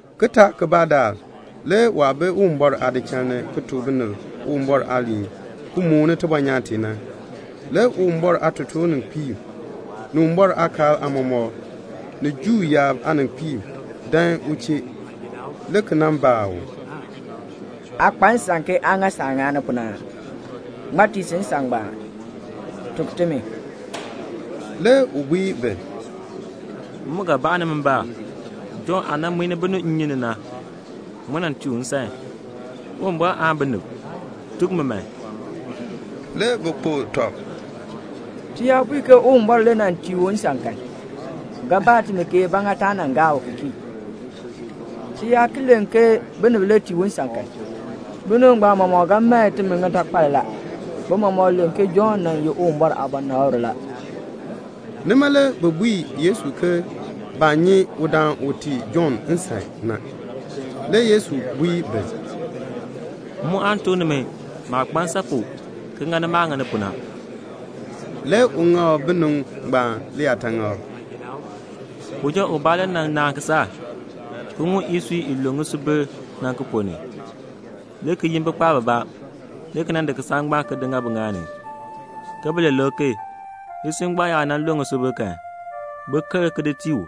Kitaak kibaa daal le waah bi Uwumbɔr aadichal ni ki tuk binib Uwumbɔr aaliin, ki mooni tibɔnyaan tee na, le Uwumbɔr aatotoorninkpiib, ni Uwumbɔr aakaal aamɔmɔkb, ni Juu yaab aaninkpiib dan u chee, le ki nan baa u, "Aa kpa nsan ke aa ŋa saah ŋani pu na aa? Ŋmaa tii si nsan ngbaan? Tuk timi." Le u bui bi, "M mu ga baa nimi mbaan. Jɔnn aah nan muin binib nnyun ni na, ŋmaa nan tii u nsan? Uwumbɔr aan binib? Tuk mi man." Le bi kpokl tɔb, "Ti yaa bui ke Uwumbɔr le tii u nsan kan, u ga baa timi, ba ŋa taa gaa u ki kii. Ti yaa ki len ke binib le tii u nsan kan, binib ngbaan mɔmɔk ga mae timi ŋitakpal la; bi mɔmɔk len ke Jɔnn nan ye Uwumbɔr aabɔnabr la." Nima le bi bui Yesu ke baa nyi udaan u tii Jɔnn nsan na. Le Yesu bui bi, "M mu aan tuk nimi maah kpa nsan pu ki ŋa maah ŋani pu na." Le u ŋak binib ngbaan liyaataŋakl, "Uja ubaa le nan naan kisaak, ki ŋum isui i lu ŋisubil na ki ponn ni, le ki yin bikpaab bibaa, le ki di kisaak ngbaan ki di ŋa biŋaal ni, ke bi li lik ki. Isui ngbaan yaa nan lue ŋisubil kan, bin ker ki di tii u,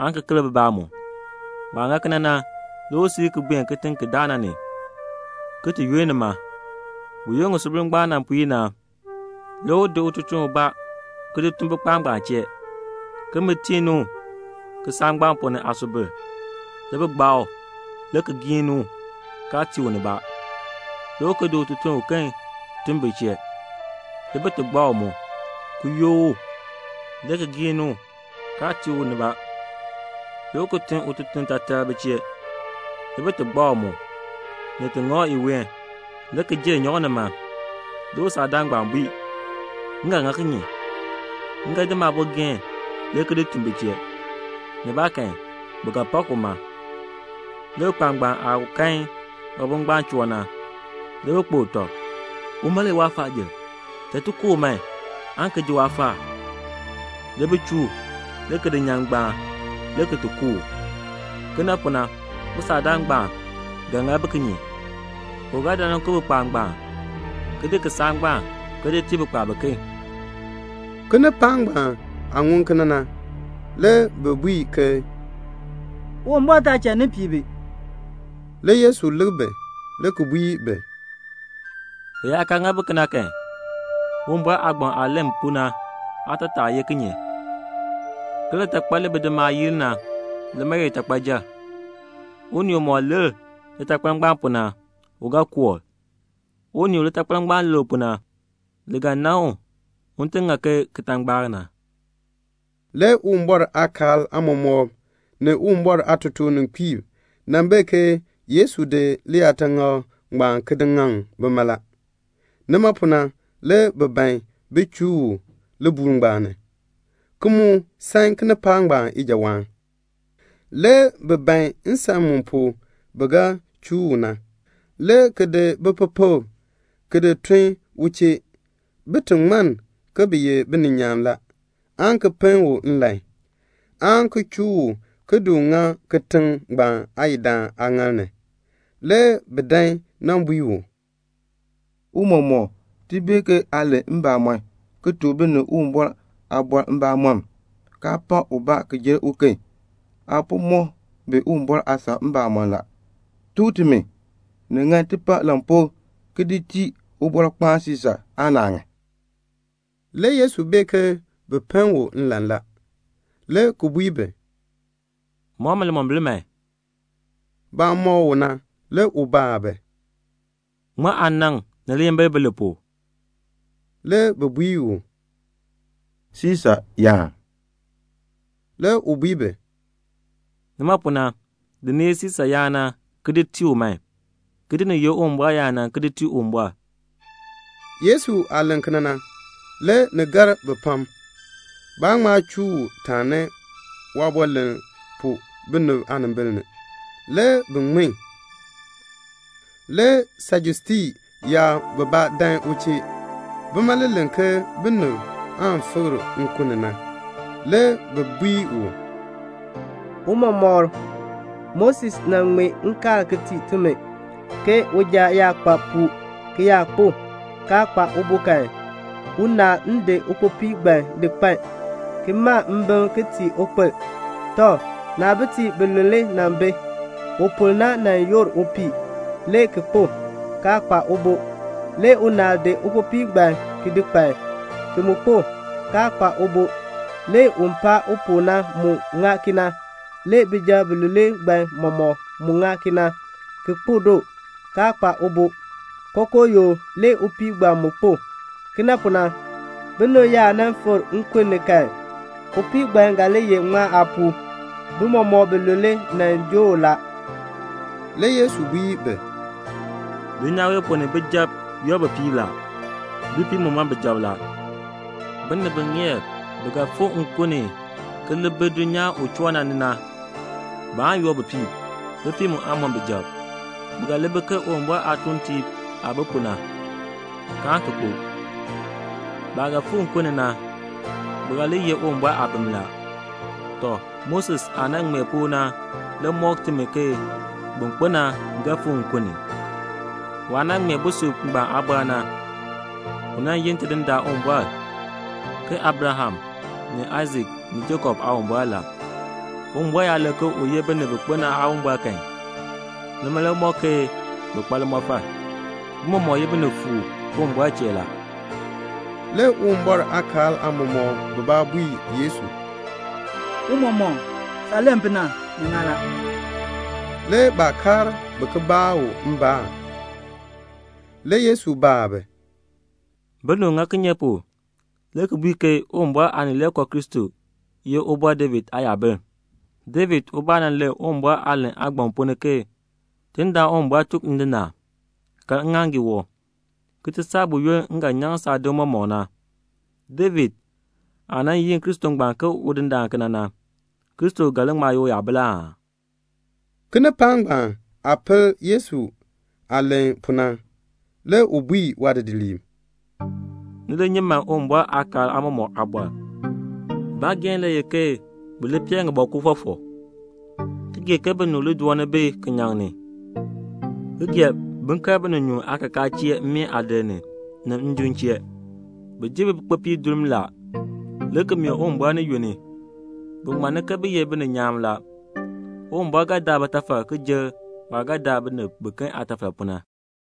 aan ki ker bibaa mu. Waah ŋa kena na, le u siir ki buen kitiŋ ki daa na ni, ki ti yunn nima. Buyoonn ŋisubil ngbaan nan puir na, le u di ututuln ubaa, ki di tun bikpaab ngbaan chee, ke bin tii ni u ŋisubil kisaak ngbaan ponn ni. Le bi gbaa u, le ki giin ni u, kaa tii u nibaa. Le u ki di ututuln uken tun bi chee. Le bi gbaa u mu, ki yook u, le ki giin ni u, kaa tii u nibaa. Le u ki tun ututuln taatar bi chee. Le bi gbaa u mu, ni ti ŋa u iween, le ki jenn nyan u nima. Le usaakdaan ngbaan bui, 'M ga ŋa kinye? M ga di maabogeen le ki di tun bi chee. Nibaakan, bi ga pak uma la.' Le bikpaab ngbaan aah kan waabo ngbaan choo na, le bi kpokl tɔb, 'Uma le ye waafaajil. Cha ti ku u man, aan ki ji waafaal.' Le bi chuu u, le ki di nyan ngbaan, le ki ti ku u. "Kena pu na, usaakdaan ngbaan ga ŋa bi kinye? U ga dan nan ku bikpaab ngbaan, ki di kisaak ngbaan ki di tii bikpaab biken." Kinipaak ngbaan aah ŋun kena na, le bi bui ke, "Uwumbɔr taa cha ni pii bi." Le Yesu lik bi, le ki bui bi, "U yaa kaa ŋa bi kena kan, Uwumbɔr aagbaŋ aah len pu na aatataa ye kinye? ke 'Litakpal li bidimaab yii li na, lima le ye litakpayil.' Unii umɔk lir litakpal ngbaan pu na, u ga koor. Unii u litakpal ngbaan lir u pu na, li ga nan u, un ŋa ke kitangbaak na." Le Uwumbɔr aakaal aamɔmɔkb ni Uwumbɔr aatotoor-ninkpiib bee ke Yesu di liyaataŋakl ngbaan ki ŋaŋ bima la. Nima pu na le bi ban bin chuu u libuul ngbaan ni, ki mu san kinipaak ngbaan ijawaan. Le bi ban nsan mu pu bi ga chuu u na, le ki di bipepekb, ki di tun u chee, bin ti ŋmann ke bi ye bininyaan la, aan ki pen u nlan, aan ki chuu u ki di ŋa kitiŋ ngbaan aayidaan aaŋaal ni. Le bi dan nan bui u, "Tiicha, ti bee ke aa len mbamɔn, ki tuk binib Uwumbɔr aaliin mbamɔm, kaa pak ubaa ki jer uken. Aa po mɔk bi Uwumbɔr aasan mbamɔm la. Tuk timi, ni ŋan ti pa lampuu ki di tii Ubɔrkpaan Siisa aan naa ŋan?" Le Yesu bee ke bi pen u nlan la, le ki bui bi, "Mɔk mi limombil." Baah mɔk u na le u baa bi, "Ŋmaa aanaŋ ni liyimbil bi li pu?" Le bi bui u, "Siisa yaan." Le u bui bi, "Nima pu na, ni di ni ye Siisa yaan na ki di tii u man, ki di ni ye Uwumbɔr yaan na ki di tii Uwumbɔr." Yesu aah len kena na, le ni gar bi pam. Baa ŋma chuu u taani waaliin pu binib aanimbil ni. Le bi ŋmin. Le Sajusii yaab bibaa dan u chee. Bima le len ke binib aan fikr nkun ni. Le bi bui u, "Tiicha, Moses nan ŋmee nkaal ki tii timi, ke 'Uja yaa kpa puu ki yaa kpo, kaa kpa ubo kan, unaal n di ukpopii ngbaan di kpan, ki ma mbim ki tii ukpil.' Tɔ, naabitiib bilule nan bi. Upol na nan yoor upii, le ki kpo, kaa kpa ubo. Le unaal di ukpopii ngbaan ki di kpan, ki mu kpo, kaa kpa ubo. Le un paa u pu na mu ŋa kena. Le bijab bilule ngbaan mɔmɔk mu ŋa kena, ki kpo doo, kaa kpa ubo. Kookoo yoo le upii ngbaan mu kpo. Kena pu na, binib yaa nan fikr nkun ni kan, upii ngbaan ga li ye ŋmaa aapuu? Bi mɔmɔk bilule nan joo u la." Le Yesu bui bi, "Dulnyaa wee ponn ni bijab yoor bipiib la. Bipiib mu mɔn bijab la. Binib bi ŋeer bi ga fikr nkun ni ki li bi dulnyaa u choo na ni na, baan yoor bipiib. Bipiib mu aan mɔn bijab. Bi ga li bi ke Uwumbɔr aatuuntiib aah bi pu na, kaan ki kpo. Baah ga fikr nkun ni na, bi ga li ye Uwumbɔr aabim la. Tɔ, Moses aah nan ŋmee pu na le mɔk timi ke bin kpo na ga fikr nkun ni. Waah nan ŋmee busub ngbaan aabɔr na, u yi Tidindaan Uwumbɔr ke Abraham ni Aisak ni Jakob Aawumbɔr la. Uwumbɔr yaa len ke u ye binib bi kpo na Aawumbɔr kan, nima le ŋmɔk ke bi kpa limɔfal. Bi mɔmɔk ye binifuub Uwumbɔr le chee." Le Uwumbɔr aakaal aamɔmɔkb bibaa bui Yesu, "Tiicha, saah len pu na, ni ŋan la." Le baa kaar bi ki baa u mbaan. Le Yesu baa bi, "Binib ŋa kinye pu le ki bui ke Uwumbɔr Aanileekoo Kristo ye Ubɔr David aayabil? David ubaa nan len Uwumbɔr aalahn aagbaŋ ponn ni ke 'Tidindaan Uwumbɔr tuk Ndindaan: Kaln ŋŋaaŋgii wɔb, ki ti saa buyoonn m ga nyaŋ saadim mɔmɔk na.' David aah nan yi Kristo ngbaan ke Udindaan kena na, Kristo ga li ŋma ye uyabil aa?" Kinipaak ngbaan aah pel Yesu aah len pu na, le u bui waadidiliib, "Ni li nyi man Uwumbɔr aakaal aamɔmɔkb aabɔr. Baageehn le ye ke bi li pee ŋibɔkur fɔfɔk, ki gee ke binib doon bi kinyaŋ ni, ki gee bin kal bininyuun aakakaa chee mmeen aadir ni, ni njim chee. Bi ji bikpopiib durm la, le ki mee Uwumbɔr ni yunn, bin ti ŋmann ke bi ye bininyaan la. Uwumbɔr ga daa bitafal ki jer waah ga daa binib biken aatafal pu na."